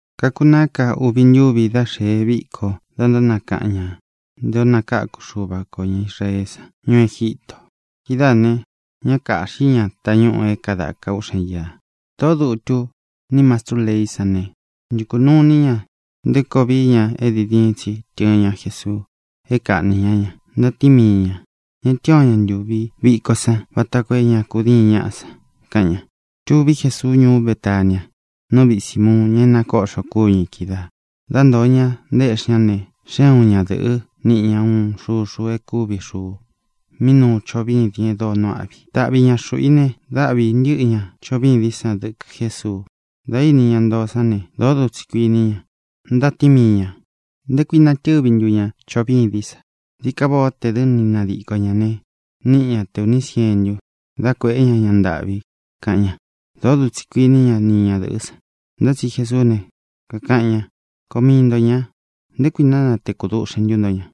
Kakunaá ka uvi ntúvi dá xēe viko da ntánakaꞌan ña nté ō nakáku Xuva kō ña Israeé san ñuú Egítō. Kidáā ne, ñá kāꞌxi ña tañúꞌū é kadāka úꞌxen iā. Tōꞌó dutu ní mastrú leí san ne, ntukū nuu iní ña nté koo vií ña é diin diin tsi tɨɨn ña Jesuu é kaꞌnī ñá ña. Ntatíin mii ñā: —Ña tɨ́ɨn o ña ntūvi viko san, vata koo é ña kudíin ñaꞌa san —kaꞌan ña. Tuví Jesuu ñuú Betania nú viꞌi Sīmuun, ña é nakoꞌxo kúñu ī kídaā. Dá ntōo ña, ntaéꞌxi ña ne, xée uun ñadɨ̄ꞌɨ́, niꞌi ña uun xuxu e kúvi xuu mí nuu choꞌo vîdin e dóo nuu áꞌvi. Taꞌvi ña xuꞌū i ne, dáꞌvī ntɨꞌɨ ña choꞌo vîdín san dɨkɨ Jésuu. Dā íni ña ntoo sán ne, dōó dutsi kuiní ña. Ntatíin mii ñā: —¿Nté kui natɨvī ntú ña choꞌo vîdín sa? Dií ka váꞌā ó tē dɨ́ ni nadiko ñā ne, níꞌi ña te ūní sientu, dá kuēꞌé ña ña ntāꞌvi —kaꞌan ña. Dōó dutsi kuiní ña ni ñadɨ̄ꞌɨ́ san. Ntá tsi Jesuú ne, kakaꞌan ña: —Koo mii nto ñā. ¿Nté kui ntánatekū duꞌxen ntu nto ña?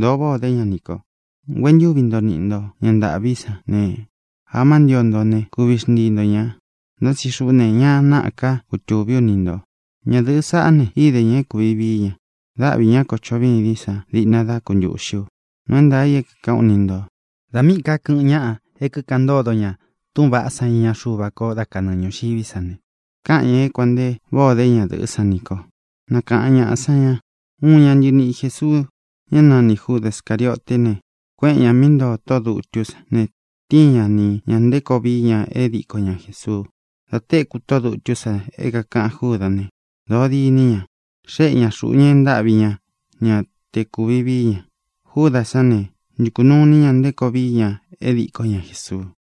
Dōo váꞌā ó de ña nī ko. Nguentúvi ntoo niꞌi nto ña ntāꞌví san ne, amá ntio nto ne, kuvi xntii nto ñā. Ntá tsi xuꞌú ne, ña náꞌā ká kutūví u ni ntō. Ñadɨ̄ꞌɨ́ saꞌá ne, īde ña é kūvi vií ña. Dáꞌvi ñā kó choꞌo vîdín san diꞌna dá kuntuꞌxi u. Nuu é ntaā i é kākaꞌán u ni ntō: Dā míꞌī ká kɨꞌɨn ñáꞌa é kikaꞌan ntódo ña túꞌūn vaꞌá san iña Xuva ko dá kanɨɨ ñūxiví sa ne, káꞌan ñā é kuān nte váꞌā o dé ñadɨ̄ꞌɨ́ san nī kó ne, nakaꞌan ñāꞌa san ña. Uun ña ntɨniꞌi Jēsuu, ñá nanī Júda Scārioté ne, kuéꞌen ñā mí ntoo tóꞌō dutú san ne, tíin ña ni ñā nté koo vií ña é diko ña Jēsuu. Dā téku tóꞌō dutú san é kākaꞌan Júdā né, dōó diní ña. Xéꞌe ñā xuꞌu ña e ntáꞌvi ña ña te kuvi vií ña. Júdā sán ne, ntukū nuu iní ña nté koo vií ña é diko ña Jēsuu.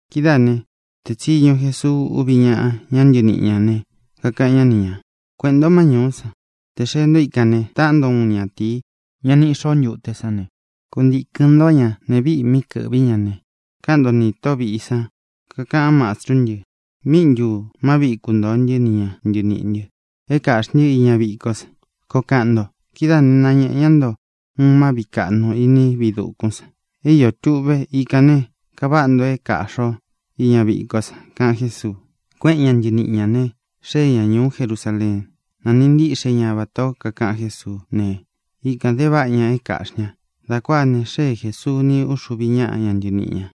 Kidáā né, teé tsiñu Jesuu úvi ñáꞌa, ña ntɨniꞌi ñā ne, kakaꞌan ñá ni ñā: —Kueꞌēn ntó má ñūú san. Tē xee ntó ikān ne, taꞌán nto uun ñatīí, ña niꞌi xoó ntute sán ne, kuntīkɨn ntó ña. Neé viꞌi mí kɨ̄ꞌví ña ne, káꞌan nto nī tóꞌo vīꞌi san: “Kakaꞌan Mástrú ntɨ: ¿Míꞌi ntū má viꞌi kuntōo ntɨ́ ni ña ntɨniꞌī ntɨ é kāꞌxí ntɨ iña vikó san?”, koo kaꞌan nto. Kidáā né, nañēꞌe ñá nto uun má viꞌi kāꞌnu iní viꞌi dūkún san. É iō tuꞌve. Ikān ne, kaváꞌa nto é kāꞌxi o iña vikó san —kaꞌan Jésuu. Kuéꞌen ña ntɨniꞌi ñā ne, xée ña ñūú Jerusaleen. Nāniꞌi ntiꞌxe ñá vatā ó kakaꞌan Jésuú ne, ikān de váꞌa ña é kāꞌxí ña. Dā kuáā ne, xée Jēsuu ni uxuvi ñáꞌa ña ntɨniꞌi ñā.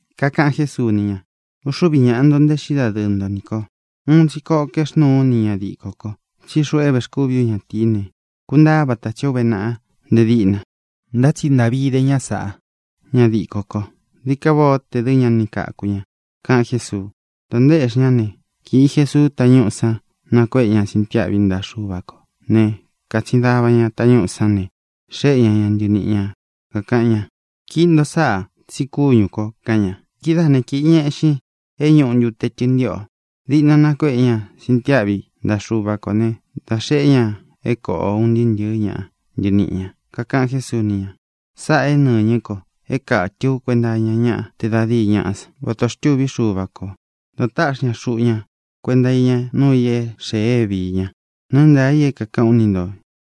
Kakaꞌan Jésuu ni ña: —Uxúvi ñāꞌa nto ntaéꞌxi dadɨɨ nto nī ko. Uun tsi koꞌo kaexnúu ú nī ña dikō ko. Tsí xuꞌu é vēxkúvi ú ñatīí ne, kuntaá vata tsī ó uve naꞌa nte díꞌna. Ntá tsi ntaꞌvi idé ña sāꞌá, ña dikó ko. Dií ka váꞌā ó tē dɨ́ ña ni kāku ña —kaꞌan Jésuu. Dā ntaéꞌxi ñá ne, kīꞌi Jesuu tañúꞌū san. Nakuéꞌe ña sintiáꞌvi ntaꞌa Xuva kō né, kātsin dava ña tañúꞌū sán ne, xéꞌe ña ña ntɨniꞌi ñā, kakaꞌan ña: —Kiꞌi nto sáꞌā, tsi kúñū ko —kaꞌan ña. Kidáā né, kīꞌi ña eꞌxin é ñūꞌu ntute tɨntiꞌo. Diꞌna nakuéꞌe ña sintiáꞌvi ntaꞌa Xuva kō né, dā xeꞌé ña é kōꞌo un ntɨɨ́ ntɨ̄ɨ́ ña ntɨniꞌi ñā. Kakaꞌan Jésuu ni ña: —Sáꞌā é nɨñɨ́ ko é kātɨ ú kuenta iña ñá te da díi ñaꞌá san, vata ō xtúvi Xuva kō da táꞌxi ña xuꞌu ña kuenta iña núu ī é xēe é viī ña. Nuu é ntaā i é kākaꞌán u ni ntō: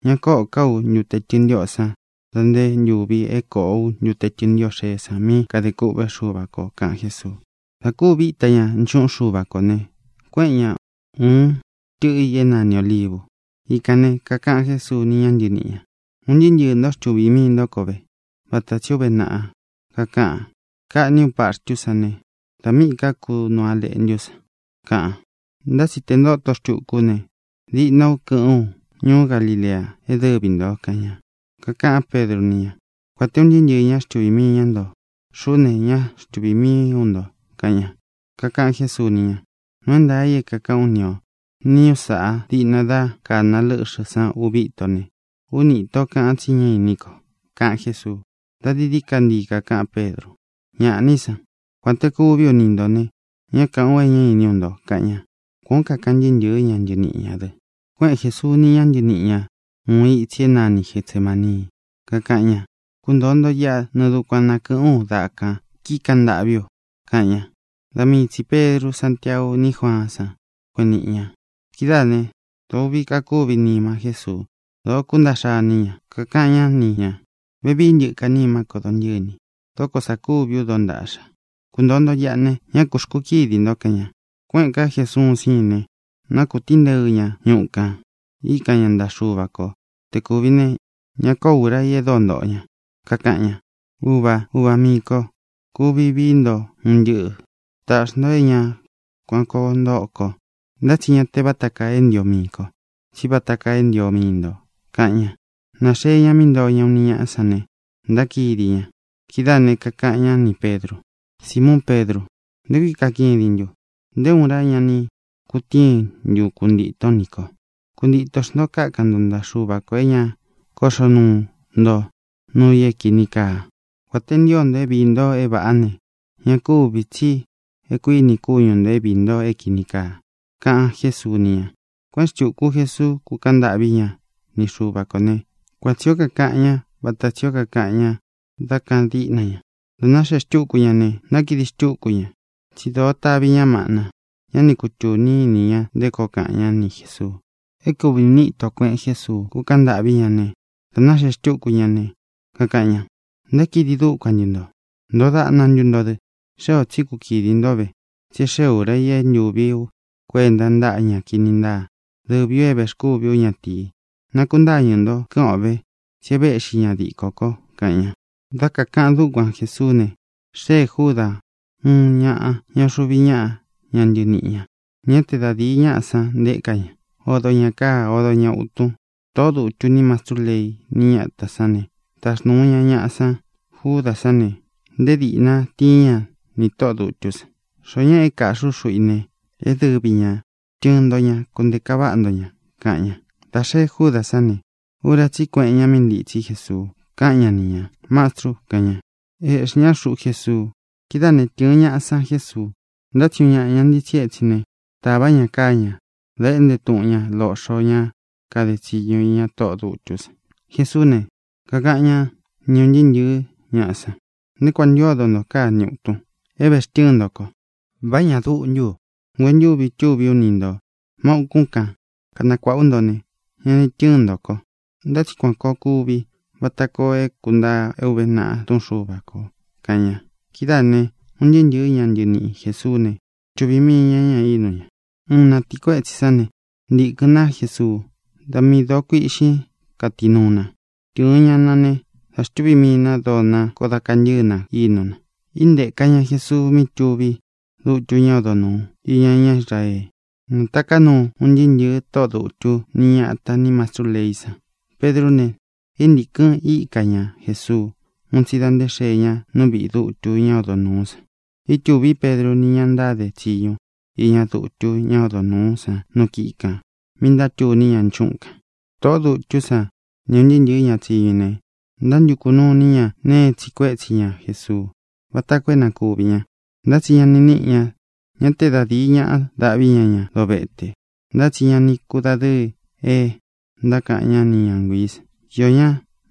Ña kóꞌō ká u ntute tɨntiꞌó san da nté ntūvi é kōꞌo ú ntute tɨntiꞌo xeé san mí kadē kûꞌvé Xuva kō —kaꞌan Jésuu. Dā kúvi íta ña nchuꞌun Xúva kō ne, kuéꞌen ña ūun tɨꞌɨ i é nani Ōlivu. Ikān ne, kakaꞌan Jésuu ni ña ntɨníꞌi ñā: —Un ntɨɨ́ ntɨɨ̄ ntó xtuvī mii ntó ko ve, vata tsī ó uve naꞌa kakaꞌan: “Kaꞌní u paxtú san ne, da míꞌī ká kunu á leꞌntú san”, kaꞌan. Ntá tsi tē ntóto xtuku ú ne, diꞌna ú kɨ́ꞌɨ̄n ú ñuú Galilea é dɨvi ntō —kaꞌan ña. Kakaꞌán Pedru ni ña: —Kuān te un ntɨɨ́ ntɨɨ̄ ñá xtuvī mii ña nto, xuꞌú ne, ñá xtuvī mii ú nto —kaꞌan ña. Kakaꞌan Jésuu ni ña: —Nuu é ntaā i é kākaꞌán u ni ō: Niñú sāꞌa, diꞌna dá kāna lɨ́ꞌxɨ̄ san uvi íto ne, úni īto kaꞌan tsí ña inín ko —kaꞌan Jésuu. Dā dií dií ka ntii kakaꞌán Pedru: —¡Ñaꞌá ni san! Kuān te kuví u ni ntō ne, ñá kāꞌán u é ñá iní ú nto —kaꞌan ña. Kuan ō kaꞌan un ntɨɨ́ ntɨ̄ɨ́ ña ntɨniꞌi ñā dɨ. Kuéꞌen Jēsuu ni ña ntɨníꞌi ñā uun itsi é nani Getsemānii. Kakaꞌan ña: —Kuntoo nto iꞌa, nɨɨ dukuan na kɨ̄ꞌɨ́n u daꞌa kān, kíkaꞌan ntâꞌví u —kaꞌan ña. Da mii tsī Pedru, Sántiau ní Juaán san kueꞌen níꞌi ña. Kidáā né, dōo uꞌvi kakúvi nima Jésuu; dōo kúntaꞌxa iní ña. Kakaꞌan ñá ni ñā: —Vevií ntɨka nimá ko dontɨ́ni. Dóko sā kúvi ú dontaꞌxa. Kuntōo nto iꞌa ne, ñá ku xkukídi nto —kaꞌan ña. Kuéꞌēn ká Jesuu ún siin ne, nákūtínteɨ ña ñuꞌu kān. Íkan ña ntaꞌa Xuva ko te kūvi ne, ña kóo ura í e dóo ntoꞌo ña. Kakaꞌan ña: —Uvā, uva miī ko, kuvi vií nto un ntɨꞌɨ̄. Tāꞌxi nto é ña kuan kōo ntóꞌo ko. Ntá tsi ña te vata kaa é ntio mii ko, tsí vata kaa é ntio mii nto —kaꞌan ña. Nāxee ña mí ntoo ña uni ñáꞌa san ne, ntákidi ña. Kidáā ne, kakaꞌan ñá nī Pedru: —Simuun Pedru, ¿nté kui kakidin ntun? ¿Nté uun ura ñá ni kutíin ntun kuntītón nī ko? Kuntitō xnto. Kákan nto ntaꞌa Xuva kō é ña kóꞌxo nto nuu i é kīni kaa. Kuān te ntío nto é viī nto é vāꞌá ne, ña kúvī, tsí e kuíni kúñu ntō é viī nto é kīni kaa —kaꞌan Jésuu ni ña. Kuéꞌen xtūku Jesuu, kúkaꞌan ntâꞌví ña ni Xuva kō né, kuan tsī ó kakaꞌan ñá vata tsī ó kakaꞌan ña dá kāꞌan díꞌna ña. Dā náxee xtúku ña ne, ntákidi xtúku ña, tsi dóo tavī ñá maꞌna. Ñá ni kutūni ini ña nté koo kaꞌan ñá ni Jēsuu. É kūvi uni íto kueꞌen Jésuu, kúkaꞌan ntâꞌví ña, ne, dā náxee xtúku ña ne, kakaꞌan ña: —¿Ntákidi dúkuan ntu ntō? ¿Ntoo daꞌna ntu nto dɨ? Xée ō tsí kukidi nto ve, tsí e xée ūra i é ntuvī ú kuenta ntáꞌa ña kini ntáa, dɨvī u é vēxkúvi ú ñatīi. Nakuntáñɨ̄ nto, kɨ́ꞌɨn o vē, tsí e véꞌxi ña dikó ko —kaꞌan ña. Dá kakāꞌan dúkuan Jesuú ne, xéē Júdā, uun ñaꞌa ñá uxuvi ñáꞌa ña ntɨniꞌi ñā. Ñá te da dīi ñáꞌa san nteka ña. Odo ñā káa, odo ña ūtun. Tōꞌó dutú nī mastrú leí ni ñatā sán ne, taxnūu ña ñaꞌa san. Júdā sán ne, nté dīꞌna tíin ña nī tóꞌō dutú san: —Xoó ñaꞌa é kāꞌxi ú xuꞌu i ne, é dɨvi ñā. Tɨɨn nto ña, kunteka váꞌa nto ña —kaꞌan ña. Dā xee Júdā sán ne, ura tsí i kuéꞌen ñā mí ntitsí Jesuu, káꞌan ñá ni ñā: —¡Mastru! —kaꞌan ña. Ēꞌxí ña xuꞌu Jesuu. Kidáā né, tɨ̄ɨn ñaꞌa san Jésuu. Ntá tsi uun ñaꞌa ña ntitsí etsin ne, tāvá ña káa ñā, da éꞌnte tuꞌun ña loꞌxo ñá kade tsiñu iña tóꞌō dutú san. Jesuú ne, kakaꞌan ñá ni ūn ntɨɨ́ ntɨ̄ɨ́ ñaꞌa san: —¿Nté kuān ntu ódo nto káa ni ūtun é vextɨ́ɨn nto ko? ¿Vá ña duꞌu ntú u? Nguentúvi itúvī ú ni ntō má ūkún kan, kanakuāꞌa ú nto ne, ña ni tɨ́ɨn nto ko. Ntá tsi kuān koo kuvi vata koo é kūntaa é ūve naꞌa Túꞌun Xuva kō —kaꞌan ña. Kidáā ne, un ntɨɨ́ ntɨ̄ɨ́ ña ntɨniꞌi Jēsuú ne, xtuvī mii ña ña, ínu ña. Uun na tīí kuetsī sá ne, ntikɨ̄n ná Jesuu. Da miī doo kuiꞌxín katinúu na. Tɨ̄ɨn ña na ne, dá xtuvī mii na dóo na. Koó da kantɨ̄ɨ́ na ínu na. Íntēka ña Jesuu mí tuví dutu ñá odo nūu iña ñá Israee. Nātaká nuu un ntɨɨ́ ntɨ̄ɨ tóꞌō dutu ni ñáta nī mastrú leí san. Pedrú ne, íntīkɨn íka ña Jesuu ún tsi da nté xee ña nú viꞌī dutu ñá odo nūú san. Ítūví Pedru ni ña ntáde tsiñu iña dutu ñá odo nūú san nu kíꞌi kān mí ntátuní ña nchúꞌun kān. Tōꞌó dutú san ni ūn ntɨɨ́ ntɨ̄ɨ́ ña tsiñu i ne, ntántukū nuu iní ña nēe é tsiꞌi kuétsi ña Jesuu, vata koo é na kuvī ña, ntá tsi ña ni níꞌi ña. Ñá te da dīi ñaꞌa daꞌví ña ña dovete, ntá tsi ña ni kudadɨ́ɨ e ntákaꞌan ñá ni ña nguiī san. Iō ñá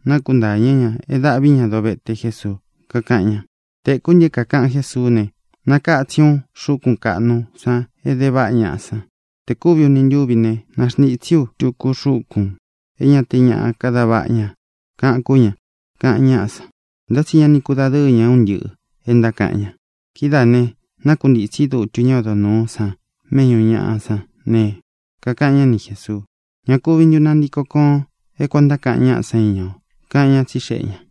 nakuntáñɨ̄ ña é dāꞌví ña dovete Jesuu, kakaꞌan ña: —Tēkú ntɨ é kākaꞌan Jésuú ne: “Nakatsín u xúkun kaꞌnu sa é de váꞌa ñaꞌa san. Tē kúvi uni ntúvi ne, naxntītsí u túku xukun é ña te ñaꞌa kada váꞌa ña”, kaꞌan kú ña —kaꞌan ñáꞌa san. Ntá tsi ña ni kudadɨ́ɨ ña é un ntɨꞌɨ̄ e ntákaꞌan ña. Kidáā ne, nákuntītsí dutu ñá odo nūú san méꞌñū ñaꞌa sán ne, kakaꞌan ñá ni Jēsuu: —¿Ña kuvi ntu nantiko koon é kuan ō ntákaꞌan ñaꞌa sa íña o? —kaꞌan ñá, tsixeꞌe ñā.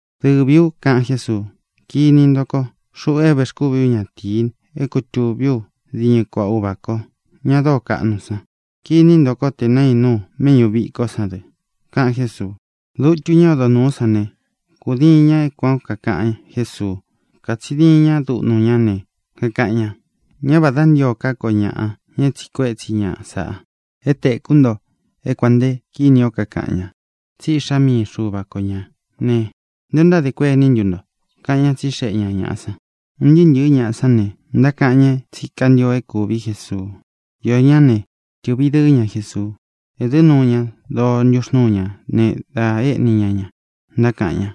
—Dɨvī u —kaꞌan Jésuu—. Kiní nto ko, xuꞌu é vēxkúvi ú ñatīi, é kutūví u diñɨ kuaꞌa Uvā ko, ña dóo kaꞌnu san. Kiní nto ko te nainu u méꞌñū viko san dɨ —kaꞌan Jésuu. Dutu ñá odo nūú san ne, kūdiin ña é kuān ó kakaꞌan Jésuu. Kātsin diin ña dúꞌnu ñá ne, kakaꞌan ña: —Ñá vādá ntio ká ko ñaꞌa, ña é tsiꞌi kuétsi ña sāꞌa. É tēkú nto é kuān nte kini o kakaꞌan ña tsí Iꞌxá mii Xuva ko ñā ne, ¿nté ō ntádē kuení ntu nto? —kaꞌan ñá, tsixeꞌe ña ñāꞌa san. Un ntɨɨ́ ntɨ̄ɨ́ ñaꞌa sán ne, ntákaꞌan ña tsí kantio é kūví Jesuu. Iō ñá ne, tɨ̄ꞌvi dɨɨ́ ña Jesuu. Ēdɨ́ nuu ña doo ntuxnúu ña ne, da éꞌni ña ña, ntákaꞌan ña: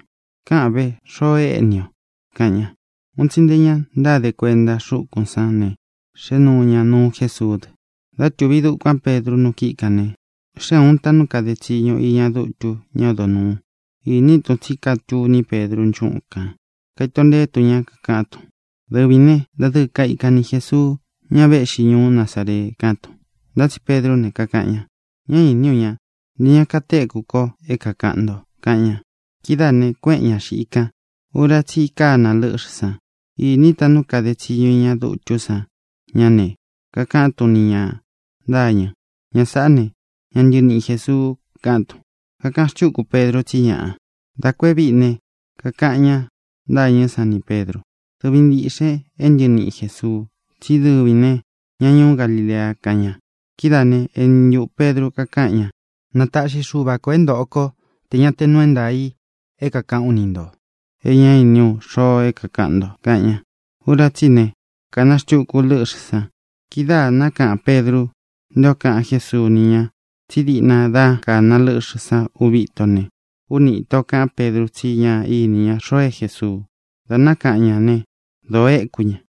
—¡Kaꞌan ve xoo éꞌni i o! —kaꞌan ña. Un tsi nte ña ntáde kuenta xúkūn sán ne, xēꞌe nuu ña nuu Jésuú dɨ. Dá tuví dukuān Pedru nu kíꞌi kān ne, xée ūun taꞌnu kade tsiñu iña dutu ñá odo nūu. Īni tun tsí katuní Pedru nchúꞌun kān. Kaito nteé tun ña, kakaꞌán tun: —Dɨvīn né, dadɨɨ kaikan ni Jēsuu, ña véꞌxi ñuú Nazaree —kaꞌán tun. Ntá tsi Pedrú ne, kakaꞌan ña: —Ñá īní u ña; ntē ña katéku ko é kākaꞌan nto —kaꞌan ña. Kidáā ne, kuéꞌen ña xiꞌi kan. Ura tsí i kána lɨ́ꞌxɨ̄ san. Īní taꞌnu kade tsiñu iña dutú san ña ne, kakaꞌán tun nī ña ntâñɨ: —Ña sāꞌá ne, ña ntɨniꞌi Jēsuu —kaꞌán tun. Kakaꞌan xtúku Pedru tsí ñaꞌa. Da kū e víꞌi ne, kakaꞌan ña ntâñɨ́ san nī Pedru: —Dɨvīn ntiꞌxen é ntɨniꞌin Jēsuu. Tsí dɨvīn ne, ña ñuú Galilea —kaꞌan ña. Kidáā né, eni ntuꞌū Pedru kakáꞌan ña: —Na taꞌxi Xuva kō é ntōꞌo kó tē ña te nuu é ntaā i é kākaꞌán u ni ntō e ñá iní u xoo é kākaꞌan nto —kaꞌan ña. Ura tsí i ne, kāna xtuku lɨ́ꞌxɨ̄ san. Kidáā nákaꞌan Pedru nté ō kaꞌan Jésuu ni ña tsí diꞌna dá kāna lɨ́ꞌxɨ̄ san uvi íto ne, úni īto kaꞌán Pedru tsi ñá īni ña xoo é Jēsuu. Dā nákaꞌan ñā né, dōo éku ña.